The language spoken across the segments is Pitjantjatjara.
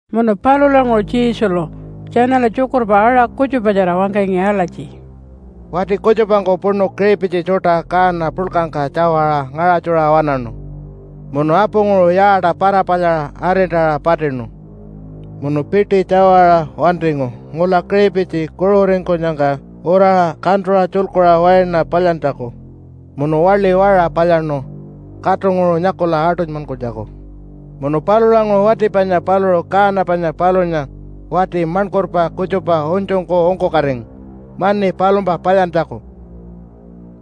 Munu palulanguṟu Jesulu tjanala tjukurpa aṟa kutjupatjara wangkangi alatji, “Wati kutjupangku puṉu kiṟipitji tjuṯa kaana puḻkangka tjawaṟa ngaṟatjuṟa waṉaṉu, munu apunguṟu yaata para-palyaṟa arintaṟa patinu, munu piṯi tjawaṟa wantingu ngula kiṟipitji kuṟuringkunyangka uraṟa kantuṟa tjulkuṟa waina palyantjaku, munu waḻi waṟa palyaṉu katunguṟu nyakula aṯunymankunytjaku. Munu palulanguṟu wati panya paluṟu kaana panya palunya wati maṉkurpa kutjupa unytjungku ungkukatingu mani palumpa palyantjaku,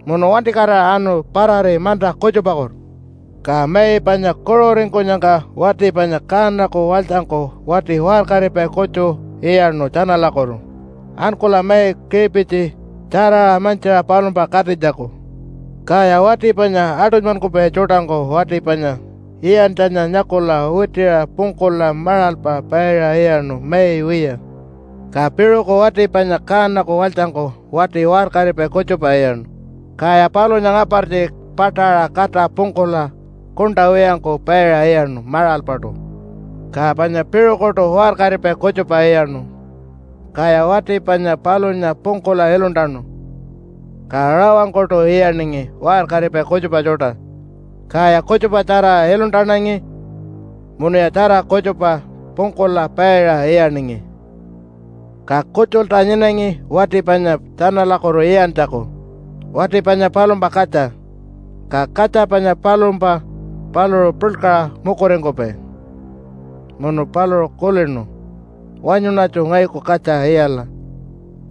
munu wantikatira anu parari manta kutjupakutu. Ka mai panya kuṟuringkunyangka wati panya kaanaku walytjangku wati waṟkaripai kutju iyaṉu tjanalakutu, ankula mai kiṟipitji tjaraṟa mantjiṟa palumpa katinytjaku. Kaya wati panya aṯunymankupai tjuṯangku wati panya iyantjanya nyakula witiṟa pungkula maṟalpa paiṟa iyaṉu mai wiya. Ka piṟuku wati panya kaanaku walytjangku wati waṟkaripai kutjupa iyaṉu, kaya palunya ngapartji paṯaṟa kata pungkula kuṉṯa wiyangku paiṟa iyaṉu maṟalpaṯu. Ka panya piṟukuṯu waṟkaripai kutjupa iyaṉu, kaya wati panya palunya pungkula iluntanu. Ka rawangkuṯu iyaningi waṟkaripai kutjupa tjuṯa, kaya kutjupatjara iluntanangi munuya tjara kutjupa pungkula paiṟa iyaningi. “Ka kutjulta nyinangi wati panya tjanalakutu iyantjaku, wati panya palumpa katja. Ka katja panya palumpa paluṟu puḻkaṟa mukuringkupai munu paluṟu kulinu, ‘Wanyuṉatju ngayuku katja iyala,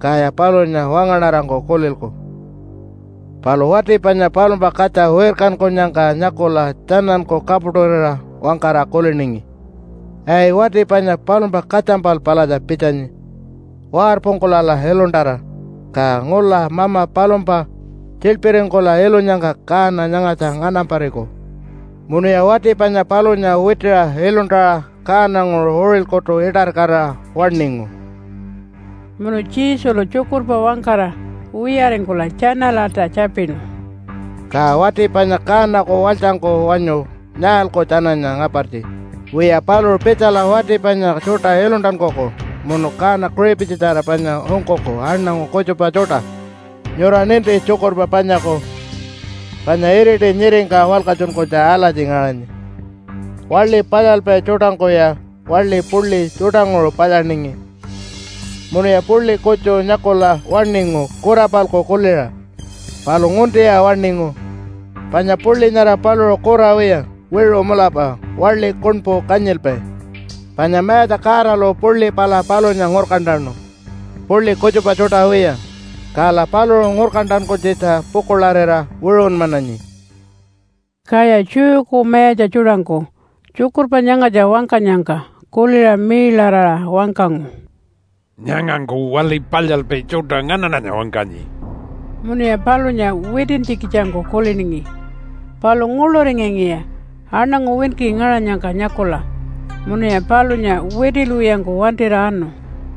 kaya palunya wangaṉarangku kulilku.’ “Palu wati panya palumpa katja wirkankunyangka nyakula tjananku kapuṯurira wangkara kuliningi, ‘Ai, wati panya palumpa katjampal palatja pitjanyi! Warpungkulala iluntara, ka ngula mama palumpa tjiḻpiringkula ilunyangka kaana nyangatja nganampariku.’ Munuya wati panya palunya witiṟa iluntaṟa kaananguṟu uṟilkutu iṯarikatira waṉingu.” Munu Jesulu tjukurpa wangkara wiyaringkula tjanalalta tjapinu, “Ka wati panya kaanaku walytjangku wanyu nyaalku tjananya ngapartji? Wiya, paluṟu pitjala wati panya tjuṯa iluntankuku munu kaana kiṟipitjitjara panya ungkuku aṉangu kutjupa tjuṯa. Nyura ninti tjukurpa panyaku, panya iriti nyiringka walkatjunkunytja alatji ngaṟanyi, ‘Waḻi palyalpai tjuṯangkuya waḻi puḻi tjuṯanguṟu palyaningi, munuya puḻi kutju nyakula waṉingu kura-palku kuliṟa. Palu nguntiya waṉingu, panya puḻi nyara paluṟu kura wiya, wiṟu mulapa waḻi kuṉpu kanyilpai. Panya Mayatja Godalu puḻi pala palunya ngurkantanu puḻi kutjupa tjuṯa wiya, kala paluṟu ngurkantankunytjitja pukuḻarira wiṟunmananyi.’” Kaya Jewku mayatja tjuṯangku tjukurpa nyangatja wangkanyangka kuliṟa miiḻaraṟa wangkangu, “Nyangangku waḻi palyalpai tjuṯa nganaṉanya wangkanyi.” Munuya palunya witintjikitjangku kuliningi. Palu nguḻuringangiya aṉangu winki ngaṟanyangka nyakula munuya palunya witilwiyangku wantira anu.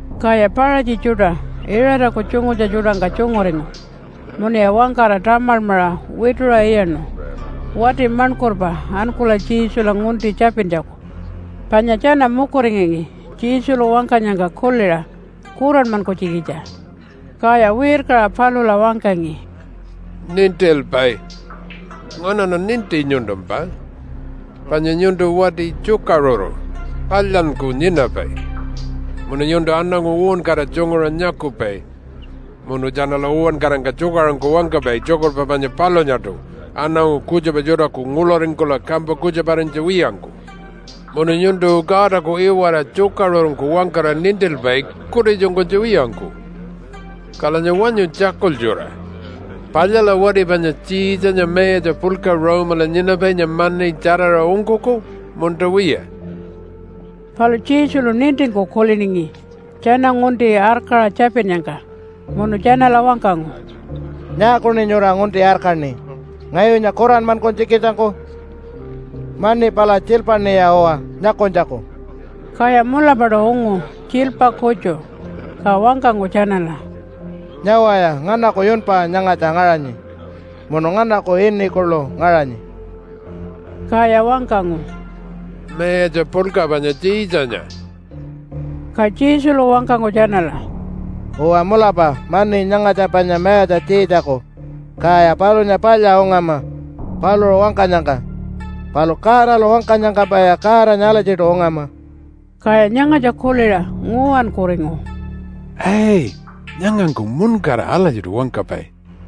Kaya Paṟatji tjuṯa Iṟataku tjungutja tjuṯangka tjunguringu munuya wangkara tamalmaṟa wituṟa iyaṉu wati maṉkurpa ankula Jesula ngunti tjapintjaku. Panya tjana mukuringangi Jesulu wangkanyangka kuliṟa kuranmankunytjikitja. Kaya wirkaṟa palula wangkangi, “Nintilpai, nganaṉa ninti nyuntumpa, panya nyuntu wati tjukaṟuru palyanyku nyinapai. Munu nyuntu aṉangu uwankara tjunguṟa nyakupai munu tjanala uwankarangka tjukaṟurungku wangkapai tjukurpa panya palunyaṯu aṉangu kutjupa tjuṯaku nguḻuringkula kampa kutjuparinytja wiyangku. Munu nyuntu Godaku iwara tjukaṟurungku wangkara nintilpai kutitjunkunytja wiyangku. Kalanya wanyu tjakultjura, palyala wati panya Tjiitjanya mayatja puḻka Rome-ala nyinapainya mani tjaraṟa ungkuku, munta wiya?” Palu Jesulu nintingku kuliningi tjana ngunti arkaṟa tjapinnyangka munu tjanala wangkangu, “Nyaakuṉi nyura ngunti arkaṉi ngayunya kuranmankunytjikitjangku? Mani pala tjiilpaṉiya uwa nyakunytjaku.” Kaya mulapaṯu ungu tjiilpa kutju. Ka wangkangu tjanala, “Nyawaya, nganaku yunpa nyangatja ngaṟanyi munu nganaku ini kuḻu ngaṟanyi?” Kaya wangkangu, “Mayatja puḻka panya Tjiitjanya.” Ka Jesulu wangkangu tjanala, “Uwa mulapa mani nyangatja panya mayatja Tjiitjaku, kaya palunya palya ungama paluṟu wangkanyangka, palu Godalu wangkanyangkampaya Godanya alatjiṯu ungama.” Kaya nyangatja kuliṟa nguwankuringu, “Ai, nyangangku muṉkara alatjiṯu wangkapai.”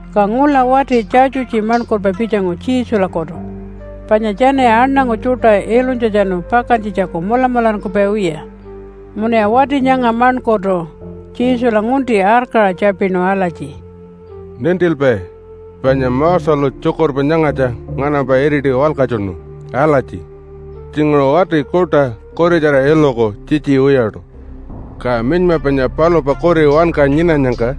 Ka ngula wati Tjatjutji maṉkurpa pitjangu Jesulakutu, panya tjanaya aṉangu tjuṯa ilunytjatjanu pakantjitjaku mulamularingkupai wiya. Munuya wati nyanga maṉkurtu Jesula ngunti arkaṟa tjapinu alatji, “Nintilpai, panya Moselu tjukurpa nyangatja nganampa iriti walkatjunu alatji, ‘Tjinguṟu wati kuṯa kuritjara iluku tjitji wiyaṯu, ka minyma panya palumpa kuri wanka nyinanyangka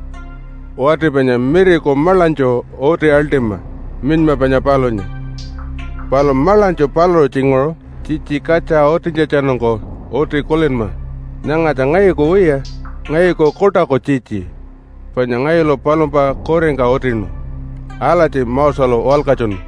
wati panya miriku maḻanytju uti aḻṯima minyma panya palunya. Palu maḻanytju paluṟu tjinguṟu tjitji katja utintjatjanungku uti kulinma, “Nyangatja ngayuku wiya, ngayuku kuṯaku tjitji, panya ngayulu palumpa kuringka utinu.” ’ Alatji Moselu walkatjunu.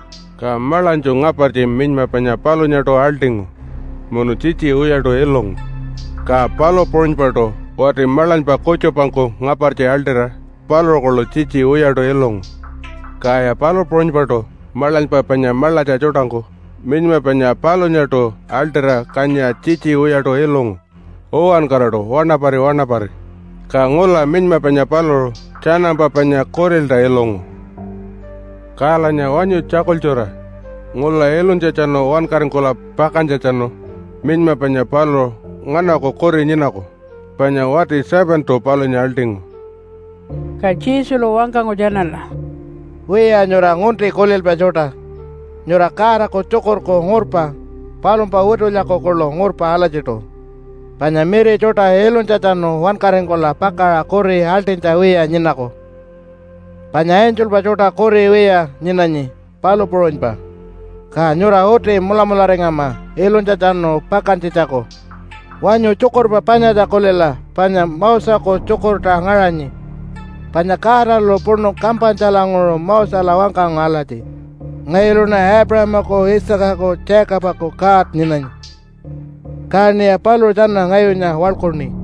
Ka maḻanytju ngapartji minyma panya palunyaṯu aḻṯingu munu tjitji wiyaṯu ilungu, ka palu puṟunypaṯu wati maḻanypa kutjupangku ngapartji aḻṯira paluṟu kuḻu tjitji wiyaṯu ilungu. Kaya palu puṟunypaṯu maḻanypa panya maḻatja tjuṯangku minyma panya palunyaṯu aḻṯira kanyiṟa tjitji wiyaṯu ilungu uwankaraṯu wanapari wanapari. Ka ngula minyma panya paluṟu tjanampa panya kurilta ilungu. “Kalanya wanyu tjakultjura ngula ilunytjatjanu wankaringkula pakantjatjanu minyma panya paluṟu nganaku kuri nyinaku? Panya wati 7-tu palunya aḻṯingu.” Ka Jesulu wangkangu tjanala, “Wiya, nyura ngunti kulilpai tjuṯa. Nyura Godaku tjukurku ngurpa palumpa witulyaku kuḻu ngurpa alatjiṯu. Panya miri tjuṯa ilunytjatjanu wankaringkula pakaṟa kuri aḻṯinytja wiya nyinaku, panya angelpa tjuṯa kuri wiya nyinanyi, palu puṟunypa. Ka nyura uti mulamularingama ilunytjatjanu pakantjitjaku. Wanyu tjukurpa panyatja kulila panya Moseku tjukurta ngaṟanyi, panya Godalu puṉu kampanytjalanguṟu Mosela wangkangu alatji, ‘Ngayuluṉa Aipuṟamaku, Isaacaku, Jacobaku God nyinanyi, kaṉiya paluṟu tjana ngayunya waḻkuṉi.’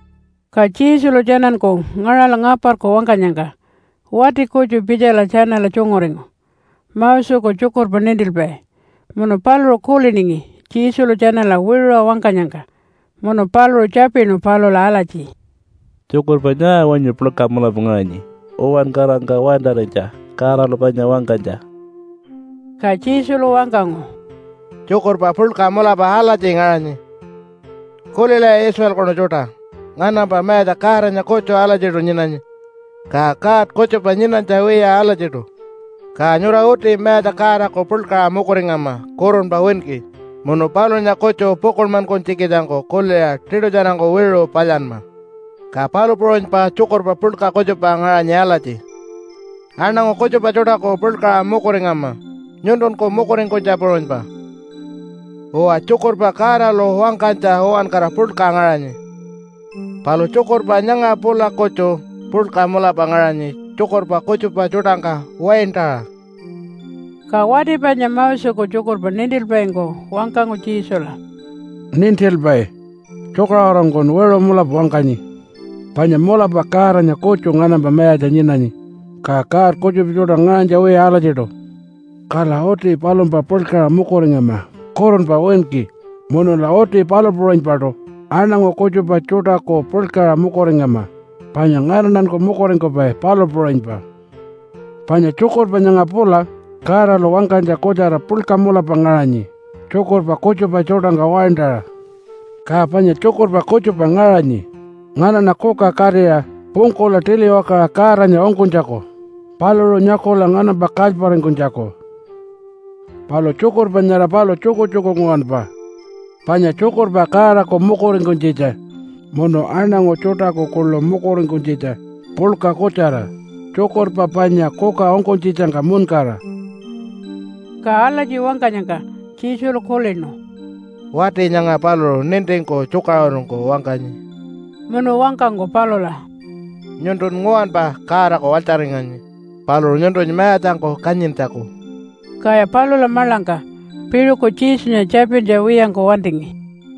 Ka Jesulu tjananku ngaṟala ngaparku wangkanyangka wati kutju pitjala tjanala tjunguringu, Moseku tjukurpa nintilpai. Munu paluṟu kuliningi Jesulu tjanala wiṟuṟa wangkanyangka munu paluṟu tjapinu palula alatji, “Tjukurpa nyaa wanyu puḻka mulapa ngaṟanyi uwankarangka waintarinytja Godalu panya wangkanytja?” Ka Jesulu wangkangu, “Tjukurpa puḻka mulapa alatji ngaṟanyi, ‘Kulilaya Israelkunu tjuṯa, nganampa Mayatja Godanya kutju alatjiṯu nyinanyi, ka god kutjupa nyinanytja wiya alatjiṯu. Ka nyura uti Mayatja Godaku puḻkaṟa mukuringama kurunpa winki, munu palunya kutju pukuḻmankunytjikitjangku kuliṟa tiṯutjarangku wiṟu palyanma.’ Ka palu puṟunypa tjukurpa puḻka kutjupa ngaṟanyi alatji, ‘Aṉangu kutjupa tjuṯaku puḻkaṟa mukuringama nyuntunku mukuringkunytja puṟunypa.’ Uwa, tjukurpa Godalu wangkanytja uwankara puḻka ngaṟanyi, palu tjukurpa nyanga pula kutju puḻka mulapa ngaṟanyi tjukurpa kutjupa tjuṯangka waintaṟa.” Ka wati panya Moseku tjukurpa nintilpaingku wangkangu Jesula, “Nintilpai, tjukaṟurungkun wiṟu mulapa wangkanyi, panya mulapa Godanya kutju nganampa mayatja nyinanyi, ka god kutjupa tjuṯa ngaṟanytja wiya alatjiṯu. Kala uti palumpa puḻkaṟa mukuringama kurunpa winki. Munula uti palu puṟunypaṯu aṉangu kutjupa tjuṯaku puḻkaṟa mukuringama panya nganaṉanku mukuringkupai, palu puṟunypa. Panya tjukurpa nyanga pula Godalu wangkanytja kutjara puḻka mulapa ngaṟanyi tjukurpa kutjupa tjuṯangka waintaṟa. Ka panya tjukurpa kutjupa ngaṟanyi nganaṉa kuka katira pungkula tiliwakaṟa Godanya ungkunytjaku paluṟu nyakula nganampa kalyparingkunytjaku. Palu tjukurpa nyara paluṟu tjukutjuku nguwanpa panya tjukurpa Godaku mukuringkunytjitja munu aṉangu tjuṯaku kuḻu mukuringkunytjitja puḻka kutjara tjukurpa panya kuka ungkunytjitjangka muṉkara.” Ka alatji wangkanyangka Jesulu kulinu, “Wati nyanga paluṟu nintingku tjukaṟurungku wangkanyi.” Munu wangkangu palula, “Nyuntun nguwanpa Godaku walytjaringanyi paluṟu nyuntunya mayatjangku kanyintjaku.” Kaya palula maḻangka piṟuku Jesunya tjapintja wiyangku wantingi.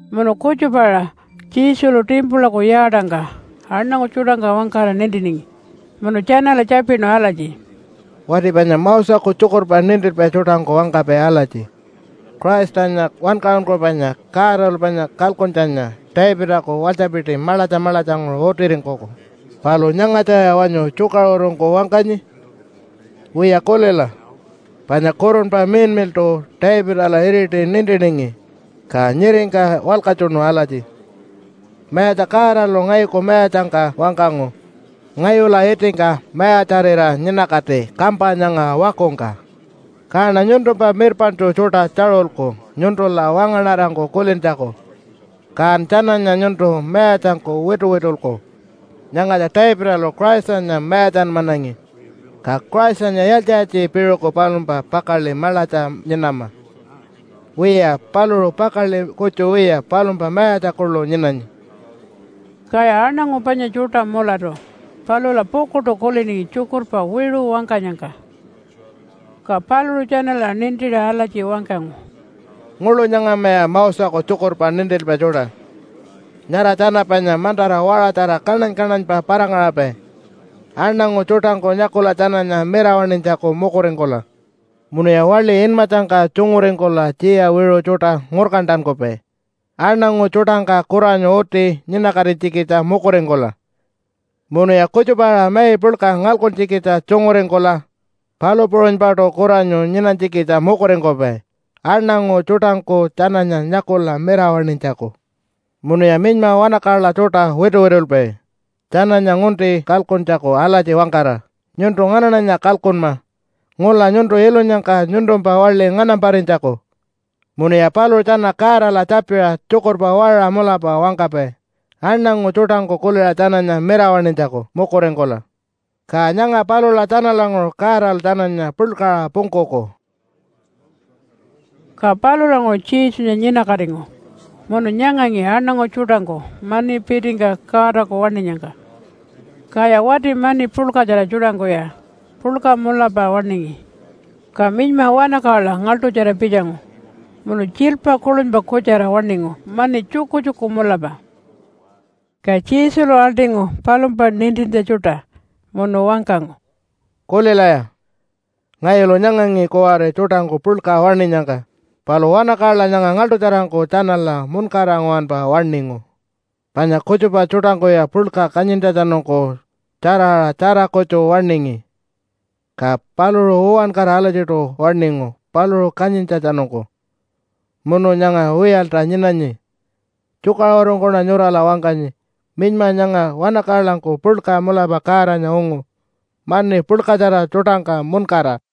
Munu kutjupa-aṟa Jesulu timpulaku yaatangka aṉangu tjuṯangka wangkara nintiningi munu tjanala tjapinu alatji, “Wati panya Moseku tjukurpa nintilpai tjuṯangku wangkapai alatji, ‘Christanya Wankaṟunkupainya Godalu panya kalkuntjanya Davidaku walytjapiti maḻatja maḻatjanguṟu utiringkuku.’ Palu nyangatjaya wanyu tjukaṟurungku wangkanyi? Wiya kulila. Panya Kurunpa Miḻmiḻṯu Davidala iriti nintiningi, ka nyiringka walkatjunu alatji, ‘Mayatja Godalu ngayuku Mayatjangka wangkangu, “Ngayula itingka mayatjarira nyinakati kampa nyanga wakungka. Kaṉa nyuntumpa mirpaṉtju tjuṯa tjaṟulku nyuntula wangaṉarangku kulintjaku, kan tjananya nyuntu mayatjangku wituwitulku.” ’ Nyangatja Davidalu Christanya mayatjanmanangi, ka Christanya yaaltji-yaaltji piṟuku palumpa pakaḻi maḻatja nyinama? Wiya, paluṟu pakaḻi kutju wiya palumpa mayatja kuḻu nyinanyi.” Kaya aṉangu panya tjuṯa mulatu palula pukuḻṯu kuliningi tjukurpa wiṟu wangkanyangka. Ka paluṟu tjanala nintiṟa alatji wangkangu, “Nguḻu nyangamaya Moseku tjukurpa nintilpai tjuṯa. Nyara tjana panya mantara waṟatjara kaṉany-kaṉanypa para-ngaṟapai aṉangu tjuṯangku nyakula tjananya mirawaṉinytjaku mukuringkula. Munuya waḻi inmatjangka tjunguringkula tjiya wiṟu tjuṯa ngurkantankupai, aṉangu tjuṯangka kuranyu uti nyinakatinytjikitja mukuringkula. Munuya kutjupa-aṟa mai puḻka ngalkuntjikitja tjunguringkula, palu puṟunypaṯu kuranyu nyinanytjikitja mukuringkupai, aṉangu tjuṯangku tjananya nyakula mirawaṉinytjaku. Munuya minyma wanakaḻa tjuṯa wituwitulpai tjananya ngunti kalkuntjaku alatji wangkara, ‘Nyuntu nganaṉanya kalkunma ngula nyuntu ilunyangka nyuntumpa waḻi nganamparinytjaku.’ Munuya paluṟu tjana Godala tjapiṟa tjukurpa waṟa mulapa wangkapai aṉangu tjuṯangku kuliṟa tjananya mirawaṉinytjaku mukuringkula. Ka nyanga palula tjanalanguṟu Godalu tjananya puḻkaṟa pungkuku.” Ka palulanguṟu Jesunya nyinakatingu munu nyangangi aṉangu tjuṯangku mani pitingka Godaku waṉinyangka. Kaya wati mani puḻkatjara tjuṯangkuya puḻka mulapa waṉingi. Ka minyma wanakaḻa ngaḻṯutjara pitjangu, munu tjiilpa kuḻunypa kutjara waṉingu mani tjukutjuku mulapa. Ka Jesulu aḻṯingu palumpa nintintja tjuṯa munu wangkangu, “Kulilaya, ngayulu nyangangi kuwari tjuṯangku puḻka waṉinyangka, palu wanakaḻa nyanga ngaḻṯutjarangku tjanala muṉkara nguwanpa waṉingu. Panya kutjupa tjuṯangkuya puḻka kanyintjatjanungku tjaraṟa tjara kutju waṉingi, ka paluṟu uwankara alatjiṯu waṉingu paluṟu kanyintjatjanungku, munu nyanga wiyalta nyinanyi. Tjukaṟurungkuṉa nyurala wangkanyi, minyma nyanga wanakaḻangku puḻka mulapa Godanya ungu mani puḻkatjara tjuṯangka muṉkara.”